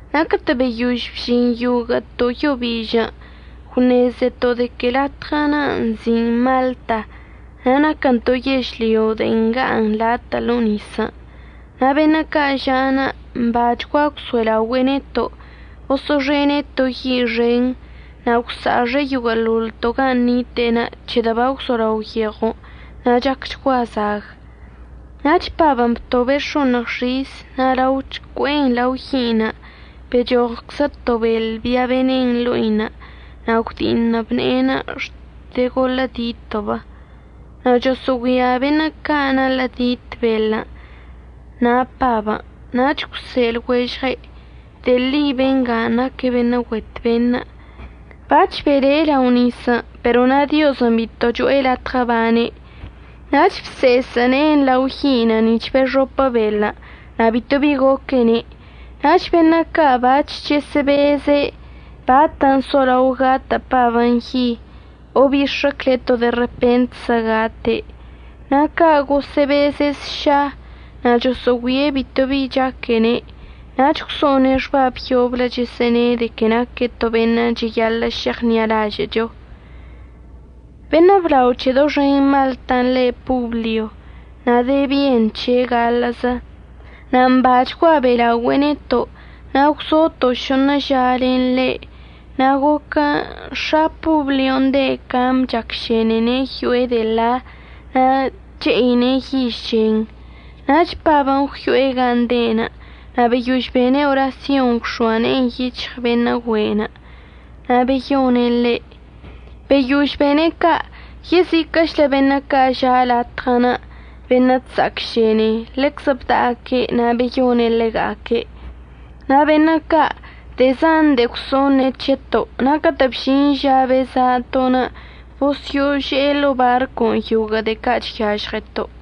Na' catə' beyož bžin yoguə'əto' yo bižən' gwṉezeto' de que latɉənə' nzi'in Malta na' naquən to yežlyo de'en nga'aṉ latə' ḻo'o nisən'. Na' beṉə' ca' ža'anə' mbachgua gwso'elaogüe'e neto', boso'oxene' to yi' xen na' gwsa'axe' yoguə'əḻoḻto' gan' nite'enə' c̱hedə' bagwzolao yeɉon' na' chacchgua zag. Nach Pabən' btobe' x̱oṉɉ xis na' lao chcue'en lao yi'inə' bechoɉczlə to beḻ bia benen ḻo'inə' na' gwdi'iṉəb ne'enə' xte goḻə'əditəb. Na' choso'ogüia beṉə' ca' naḻə'ədit beḻən' na' Pabən', nach gwse'e lɉuežɉe': ―De'e ḻi benga naque' beṉə' güet beṉə'. Bac̱h bele' lao nisən' pero na' Diozən' bito cho'e latɉə əbane'. Nach bse'esə' ne'enə' lao yi'inə' nic̱h bexopə beḻən' na' bito bi goquene'. Nach beṉə' ca' bac̱h chəsə'əbeze' bat solao gatə' Pabən' yi o əbix̱əcle' to de repentzə gate'. Na' ca' gosə'əbeze' sša na' choso'ogüie' bito bi bi chaquene' nach gwso'one' xbab yoblə chəsə'əne' de que naque' to beṉə' cheyaḻə' šeɉṉi'alažə'əcho. Beṉə' blao c̱he doxen Maltan' le' Poblio na' de bien c̱he' gaḻə'əzə, na' mbachgua be'elaogüe'e neto' na' gwzoto' šoṉə ža len ḻe'. Na' goquən' x̱a Poblion' de' cam chacšenene' yo'e de'e ḻa na' che'ine' yiž chen. Nach Pabən' gwyo'e gan' de'enə' na' beyož bene' orasyon gwx̱oa ne'enə' yic̱hɉ beṉə' güe'enə' na' beyone' ḻe'. Beyož bene' ca' yeziquə'əchlə beṉə' ca' ža' latɉən' beṉə' chsa'acšene ḻeczə bda'aque' na' beyone' ḻega'aque'. Na' beṉə' ca' de'e zan de'e gwso'oṉe' c̱heto'. Na' catə' bžin ža beza'ato', bosyo'ože'e ḻo'o barcon' yoguə' de'e ca' chyažɉeto'.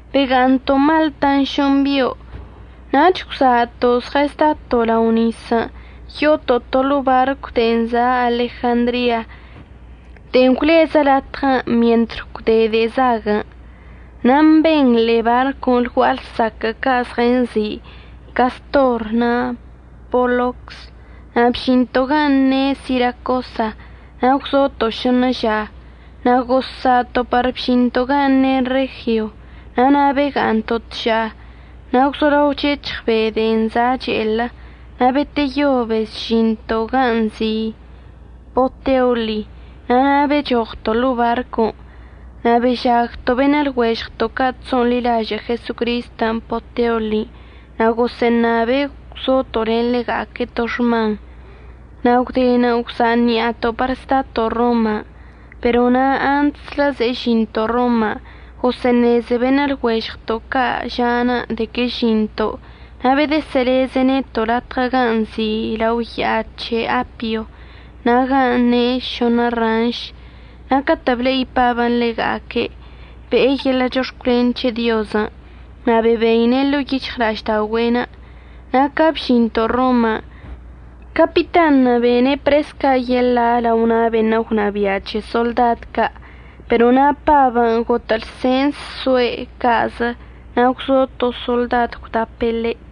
Bega'aṉto' Maltan' šoṉ bio' nach gwza'ato' zɉəzdato' lao nisən' yo'oto' to ḻo'o barcw de'en za' Alejandria de'e gwlezə latɉən' mientr gwde de'e zaguən'. Na' mben ḻe'e barcon' lgua'a lsaquə' ca' zɉənzi' Castor na' Polocs. Na' bžinto' gan' ne' Siracosa na' gwzoto' šoṉə ža. Na' gozsa'ato' par bžinto' gan' ne' Regio. Na' na' bega'aṉto' tža. Na' gwzolao chec̱hɉ be' de'en za' che'elə, na' beteyo bezžinto' ganə' nzi' Poteoli na' na' bechoɉto' ḻo'o barcon'. Na' bežagto' beṉə' lɉuežɉto' ca' chso'onḻilažə' Jesocristən' Poteoli na' gosə'əṉabe' gwzoto' len ḻega'aque' to xman. Na' gwdenə' gwza' ṉi'ato' par zdato' Roman'. Pero na' antslə ze'e žinto' Roman' gosə'əṉeze beṉə' lɉuežɉto' ca' ža'anə' de que əžinto' na' bedəsə'əleze' neto' latɉə gan' nzi' lao ya'a c̱he Apio, na' gan' ne' Šoṉə Ranš. Na' catə' ble'i Pabən' ḻega'aque', be'e yeḻə' chox̱cwlen c̱he Diozən' na' bebeine' ḻo'o yic̱hɉla'ažda'ogüe'enə'. Na' ca bžinto' Roman' capitanṉə' bene' pres ca' yeḻa' lao na' beṉə' gwnabia' c̱he soḻdad ca', pero na' Pabən' gotə' lsens soe' ca'azə na' gwzo to soḻdad gwdapə ḻe'.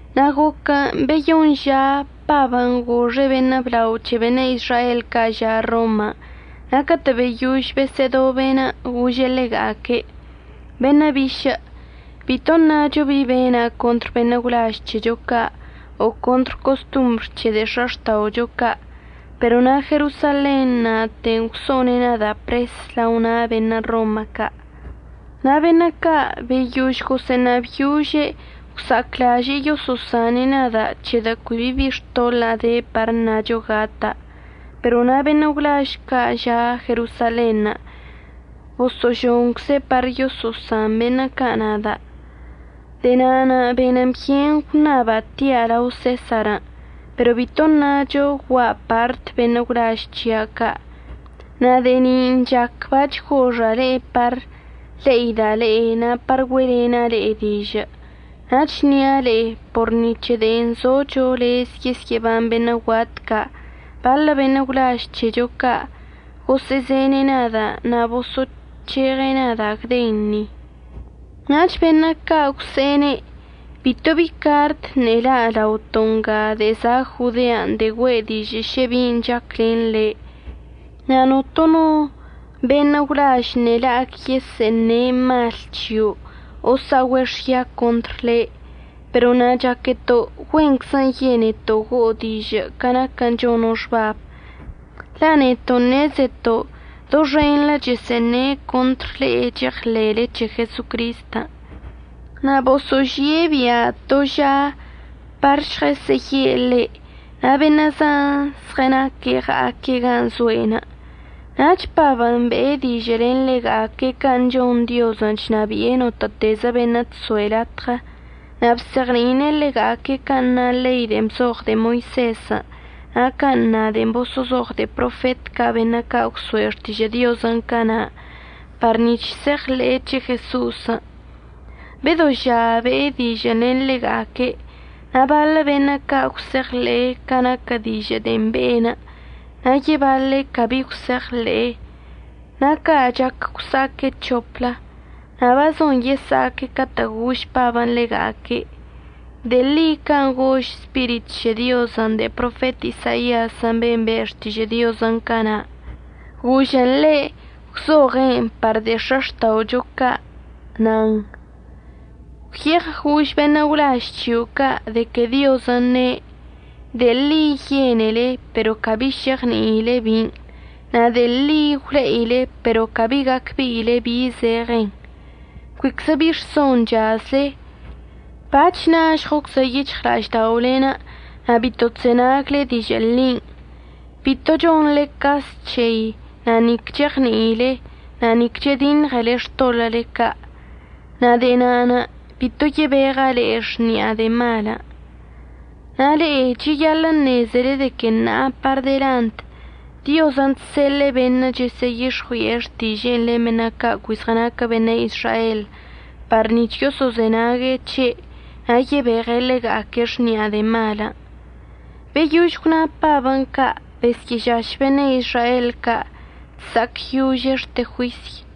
Na' goquən' beyoṉ ža Pabən' goxe' beṉə' blao c̱he beṉə' Izrael ca' ža' Roman' na' catə' beyož besə'ədobe'enə' gože' ḻega'aque': ―Beṉə' bišə', bito ṉacho bi bena' contr beṉə' gwlaž c̱hecho ca' o contr costombr c̱he de'e x̱axta'ocho ca'. Pero na' Jerosalen na'ate gwso'one' nada' pres lao na' beṉə' Roma ca'. Na' beṉə' ca' beyož gosə'əṉabyože' gwsa'aclaže'e yoso'osane' nada' c̱hedə' cui bi bi xtoḻa'a de par əṉacho gata'. Pero na' beṉə' gwlaž ca' ža' Jerosalenṉə' boso'ožoncze' par yoso'osan beṉə' ca' nada'. De'e na'anə' benən byen gwṉaba' tia' lao Sesarən', pero bito ṉacho gua'a part beṉə' gwlaž c̱hia' ca'. Na' de'e nin' chac bac̱h goxa' le'e par le'ida' le'e na' par güe'elena' le'e dižə'. Na' chnia' le'e por ni c̱he de'en zocho lez yesyə'əban beṉə' guat ca', baḻə beṉə' gwlaž c̱hecho ca' gosə'əzene' nada' na' boso'oc̱heɉe' nada' gden ni. Nach beṉə' ca' gwse'ene': ―Bito bi bi cart ṉe'e la' laoto' nga de'e za' Jodean' de'e güe' dižə' šə bin' chac len le', na' notono no beṉə' gwlaž ṉe'e la'ac yesə'əṉe' mal c̱hio' o əsa'ogüe' xya contr le'. Pero na' chaqueto' güenczən' yeneto' go'o dižə' ca naquən' chono' xbabən', la' neto' ṉezeto' doxenḻə chəsə'əṉe' contr le'e cheɉḻe'ele c̱he Jesocristən'. Na' boso'ožie' bia' to ža par žɉəsə'əye' ḻe' na' beṉə' zan zɉənaque' ɉa'aque' gan' zo'enə'. Nach Pabən' be'e dižə' len ḻega'aque' can' chon Diozən' chnabi'e notə'ətezə beṉə' chso'e latɉə. Na' bzeɉni'ine' ḻega'aque' can' na ḻei de'en bzoɉ de'e Moisezən' na' can' na de'en boso'ozoɉ de'e profet ca' beṉə' ca' gwso'e xtižə' Diozən' cana' par nic̱h se'eɉḻe'e c̱he Jeso'osən'. Bedo ža be'e dižə'ən len ḻega'aque'. Na' baḻə beṉə' ca' gwse'eɉḻe'e ca naquə dižə' de'en be'enə' na' yebaḻe' cabi gwse'eɉḻe'e. Na' ca' chac gwsa'aque' c̱hoplə, na' bazon yesa'aque' catə' gož Pabən' ḻega'aque': ―De'e ḻi can' gož Spirit c̱he Diozən' de'e profet Isaiazən' ben' be' xtižə' Diozən' cana' gožən ḻe' gwzoɉe'en par de'e x̱axta'ocho ca', nan: Gwyeɉ gož beṉə' gwlaž c̱hio' ca' de que Diozən' ne': De'e ḻi yenele pero cabi šeɉni'ile bin', na' de'e ḻi gwle'ile pero cabi gacbe'ile bi zeɉen. Cuiczə bi rson chazle. Bac̱h nažɉoczə yic̱hɉla'ažda'olen' na' bito chzenagle dižə' ḻin', bito chonḻe cas c̱hei, na' nic cheɉni'ilen, na' ni que chediṉɉele xtoḻə'əle ca'. Na' de'e na'anə' bito yebeɉa' le'e xni'a de'e malən'. Na' le'e cheyaḻə' əṉezele de que ṉa'a par delant Diozən' chseḻe'e beṉə' chəsə'əyix̱ɉui'e xtiže'enə' len beṉə' ca' cui zɉənaquə beṉə' Izrael par nic̱h yoso'ozenague' c̱he' na' yebeɉe' ḻega'aque' xni'a de'e malən'. Beyož gwna Pabən' ca' besyə'əžaš beṉə' Izrael ca' chsa'acyože' xte juisy.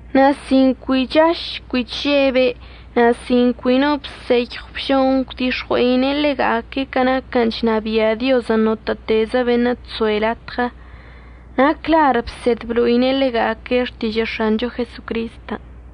Na' sin cui chaž cui chžebe' na' sin cui no no əbseyɉw əbžon gwdix̱ɉue'ine' ḻega'aque' ca naquən' chnabia' Diozən' notə'ətezə beṉə' chso'e latɉə, na' clar bsed blo'ine' ḻega'aque' xtižə' X̱ancho Jesocristən'.